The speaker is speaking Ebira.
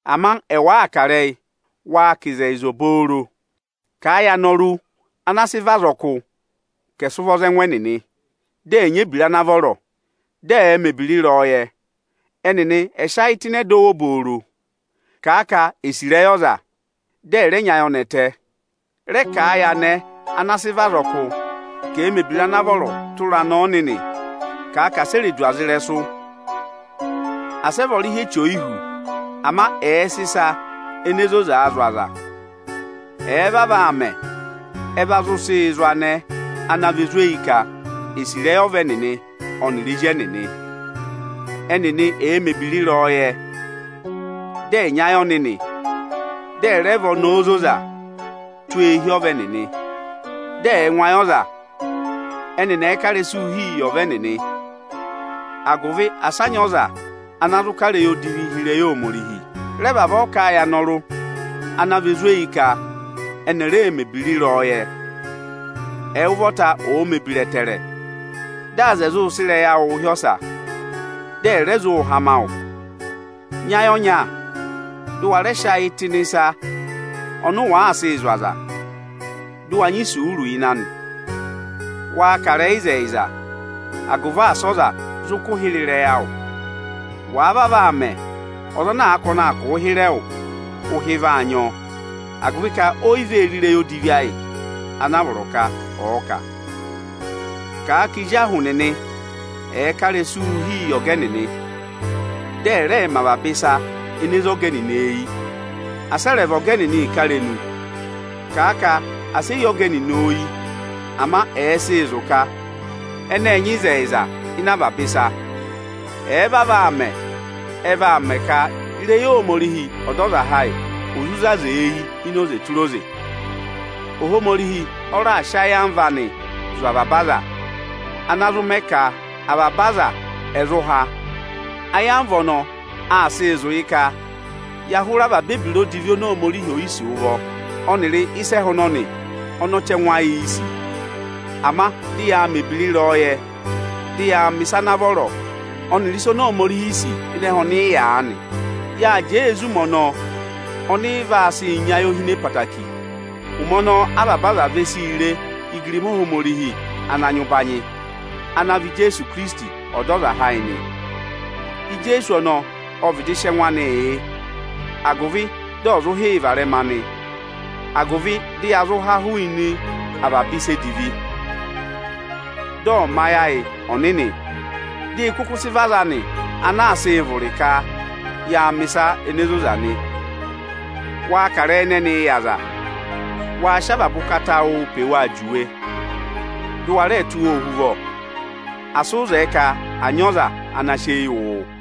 Ama ẹwụ àa kà ịrẹyị, waa kà ịzẹyịza obooro. Kàa yị anọrụ ana sị vị azọkụ ka ẹ̀ sị ụvọ za ẹngụ ẹnịnị, dị ẹ̀ nyị ebira ana vọrọ, dị ẹ̀ẹ mẹ̀ ebira ịrẹyọyẹ. Ẹnịnị ẹ̀ sị ayị tụ́ ịnị ẹdọwụ obooro. Kàa ka èe sì ịrẹyị ọza, dị ẹ̀ rẹ nyị ayọnẹtẹ. Rẹ kà a yị anẹẹ ana sị vị azọkụ ka, ẹ̀ẹ mẹ̀ ebira ana vọrọ tụra anẹẹ ọnịnị. Kàa ka asị e re du ọza ịrẹsụ, asị ẹ vị ọrịhị eche oyihú, ama ẹ̀ẹ sị ịsa ene zozaa zụ̀ aza. Ẹ̀ẹ vavọọ aa mẹ, ẹ va zụ sịị zụ̀ anẹẹ ana vị ozweyi ka è sì ịrẹyị ọva ẹnịnị ẹnịrị ezi ẹnịnị. Ẹnịnị ẹ̀ẹ mẹ̀ ebira ịrẹyọyẹ, dị ẹ̀ nyị ayị ọnịnị, dị ẹ̀ rẹ vị ọnẹẹ ozoza tụ́ eehi ọva ẹnịnị, dị ẹ̀ẹ ngụ ayị ọza. Ẹnịnị ẹ̀ẹ ka ịrẹsụụ hi yị ọva ẹnịnị, agụvị asị a nyị ọza ana zụ kà ịrẹyị odivi hi ịrẹyị Ohomorihi. Rẹ vavọọ kà a yị anọrụ ana vị ozweyi ka ẹnị ẹ̀ rẹẹ mẹ̀ ebira ịrẹyọyẹ! Ẹwụ ụvọta ọ̀ọ mẹ̀ ebira ẹtẹẹrẹ, dị aza ẹ̀ zụụ sị ịrẹyị awụụ hị́ ọsa, dị ẹ̀ rẹ zụụ hama wụ. Nyị ayị ọnya, dụ wa rẹ sị ayị tụ́ ịnị ịsa ọnị waa sịị zụ̀ aza, dụ wa nyị isuuru ịnị anị. Waa kà ịrẹyị ịzẹyịza, agụvị asị ọza zụ kụ hịrẹ ịrẹyị awụ. Wàa vavọọ aa mẹ, ọza ana àa ka ọnị aa kụ̀ụ hịrẹ ịrẹyị awụ, ụhị vaa nyị ọ, agụvị ka é yi vee re ịrẹyị odivi ayị ana a vọrọ ka ọ̀ọ kà. Kàa ka ezi ahụ nịnị ẹ̀ẹ ka ịrẹsụụ hi yị ọga ẹnịnị, dị ẹ̀ rẹẹ mẹ avaba ịsa ene zé ọga ẹnịnị eyi. Asị ẹ rẹ va ọga ẹnịnị ịkarenu. Kàa ka asị e yi ọga ẹnịnị oyi, ama ẹ̀ẹ sịị zụ̀ ka ẹnị ẹ́ẹ nyị ịzẹyịza ịnị avaba ịsa! Ẹ̀ẹ vavọọ aa mẹ, ẹ vaa mẹ ka ịrẹyị Ohomorihi Ọdọzaha ayị ọ̀ zụ zé aza eyi ini oze tụra oze. Ohomorihi ọ raa sị ayamva anị zụ̀ avaba aza, ana zụ mẹ ka avaba aza ẹ̀ zụ há. Ayamva ọnọọ aa sịị zụ̀ ka ya hụrẹ avaba ebira oni Ohomorihi è yi sì ụvọ, ọnịrị ịsa ẹhẹ ọnọnị ọnị ọchẹngụ ayịị̄ sì, ama dị yaa mẹ̀ ebira ịrẹyọyẹ, dị yaa mẹ̀ ịsa ana vọrọ ọnịrị ịsa oni Ohomorihi sì ịnị ẹhẹ ọnị ị yà aanị. Yáa jẹẹ ee zí ụmẹ ọnọọ ọnị ị vaa sị nyị ayohine ẹtẹẹtẹrẹ. Ụmẹ ọnọọ avaba aza ve sii re igirima Ohomorihi ana nyị ụbanyị, ana vị Ijeesu Ikirisiti Ọdọzaha ayị nị. Ipi 2.9Ijeesu ọnọọ ọ vịdị sị ẹngụ anịị yị, agụvị dị ọ̀ zụ hị́ yị varẹma nị, agụvị dị ya zụ há hụụnị avaba ịsa edivi. Dị ọ́ mẹ ayị ayị ọnịnị, dị ị kụkụ sị vị aza anị ana aa sịị vụrị ka yaa mẹ̀ ịsa ene zoza nị. Waa kà ịrẹyị ẹnẹnịị yà aza, waa sị avaba ụkata awụụ pe waa juwe, dị ụ wa rẹẹ tụ́ wa ohuvọ. Asị ụ zẹẹ ka à nyị ọza ana sị eyi wụ wụ.